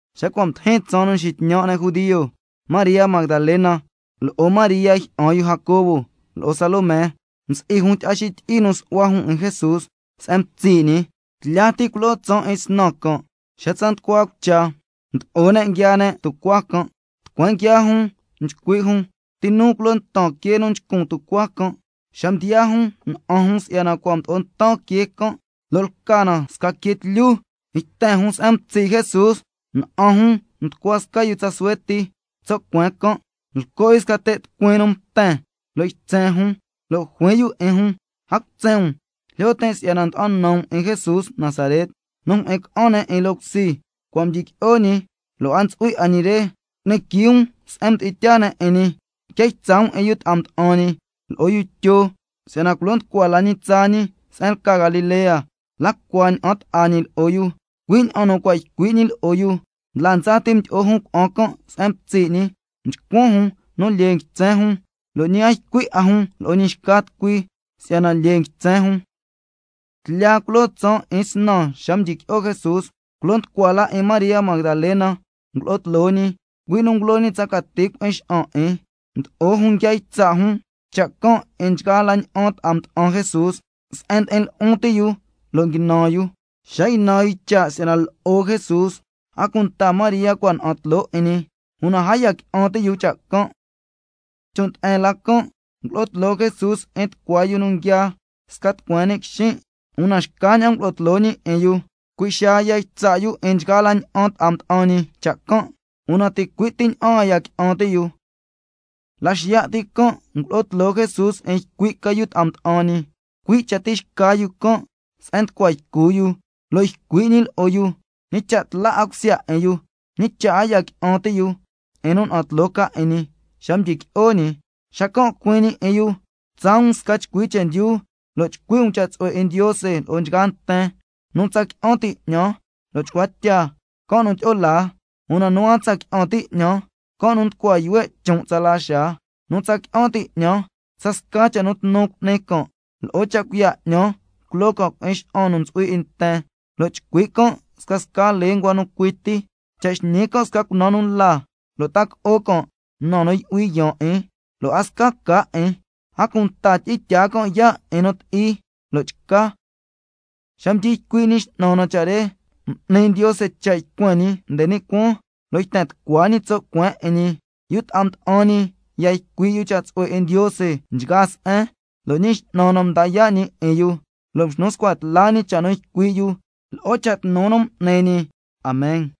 Xa cua' mdijin tsaan nu nxitñan' ne' judio, María Magdalena lo'o María jyi'an yu Jacobo, lo'o Salomé msi'i jun tyi'a xityi'i nu su'hua jun 'in Jesús se'en mtsi' ñi. Tlya ti culoo tsaan 'in snan can', xa tsa nducua cucha mdo'o ne' nguiaa ne' tucuaa can'. Tucueen nguiaa jun scasca jun nchcui' jun: ¿Ti nu culo ntan quee nu nchcun tucuaa can'? Xa mdiyaa jun, na'an jun si'yana cua' mdo'o ntan quee can', lo' lca na sca quee tlyu. Yten jun se'en mtsi' Jesús, lo' na'an jun nducua sca yu tsa suhue ti tso' cueen can', lco' yu sca te' tucuin nu mten, lo' ytsen jun. Lo' juin yu 'in jun: A cutsen um, jlyo tin' si'yana nda'an nan um 'in Jesús Nazaret nu mjyi'in ca'an ne' 'in loo cusi. Cua' mdyiqui'o ñi, lo' a ntsu'hui 'a ñi re, cu'ni quii um se'en mdi'in tyaa ne' 'in ñi. Quia ytsa' um 'in yu ta'a mda'an ñi, lo'o yu Tyo, si'yana culo nducua la ñi tsaa ñi se'en lca Galilea, la cua ña'an ta'a ñi lo'o yu, cui' ña'an nu cua' ycui' ñi lo'o yu. Ndla ndsa ti mdyi'o jun cuna'an can' se'en mtsi' ñi, mchcuan jun nu lyee nguitsen jun, lo' ñi a ycui' 'a jun lo'o ñi xca tucui, si'yana lyee ytsen jun. Tlya culoo tsaan 'in snan xa mdyiqui'o Jesús, culo nducua la 'in María Magdalena ngulo'o tloo ñi, cui' nu ngulo ñi tsa cati cui'in xa'an 'in. Mdo'o jun nguia ytsa' jun cha' can' 'in nchgaa la ña'an ta'a mda'an Jesús, se'en ndi'in lu'un ti' yu lo' nguinan yu. Xa ynan yu cha' si'yana lo'o Jesús, a cunta María cua' na'an tloo 'in ñi, una a ya qui'an ti' yu cha' can'. Chon' nde'en la can', ngulo'o tloo Jesús 'in tucua yu nu nguiaa sca tucueen ni' quixin', una xcaña'an ngulo'o tloo ñi 'in yu. Cui' xaa ya ytsa' yu 'in nchgaa la ña'an ta'a mda'an ñi cha' can', una ticui' ti ña'an a ya qui'an ti' yu. La xiya' ti can' ngulo'o tloo Jesús 'in ycui' ca yu ta'a mda'an ñi, cui' cha tixca yu can', se'en nducua ycu yu. Lo' ycui' ñi lo'o yu ñi cha' tla 'a cusya 'in yu, lo' a ya qui'an ti' yu 'in nu na'an tloo ca 'in ñi xa cua' mdyiqui'o ñi. Xacan' juin ñi 'in yu: Tsaa um sca chcui chendyu, lo' chcui' um cha' tsu'hue 'in Ndiose lo'o nchgaa nten. Nu tsa qui'an ti' 'ñan lo' chcua tya, can' nu tyi'o laa. Una nu a tsa qui'an ti' 'ñan, can' nu nducua yuhue' chon' tsala xaa. Nu tsa qui'an ti' 'ñan, scasca cha' nu tnu cu'ni can': Lo'o cha' cuiya' 'ñan, culo can' cui'in xa'an nu ntsu'hui 'in nten, lo' chcui' can' scasca lenguas nu cui ti. Cha' xñi can' sca cunaan nu la, lo' ta co'o can' na nu yu'hui yaan 'in, lo' a sca ca 'in. A cunta tyi'in tyaa can' yaa' 'in nu ti'i lo' chca. Xa mdyi ycui' Ñi X'nan na cha' re, m'ni Ndiose cha' ycuen ñi nde ni' cuaan, lo' yten tucua ñi tso' cueen 'in ñi. Yu ta'a mda'an ñi ya ycui' yu cha' tsu'hue 'in Ndiose nchgaa se'en, lo' Ñi X'nan na mda yaa' ñi 'in yu, lo' mxnu scua tla ñi cha' nu ycui' yu lo'o cha' tnu nu m'ni ñi. Amen.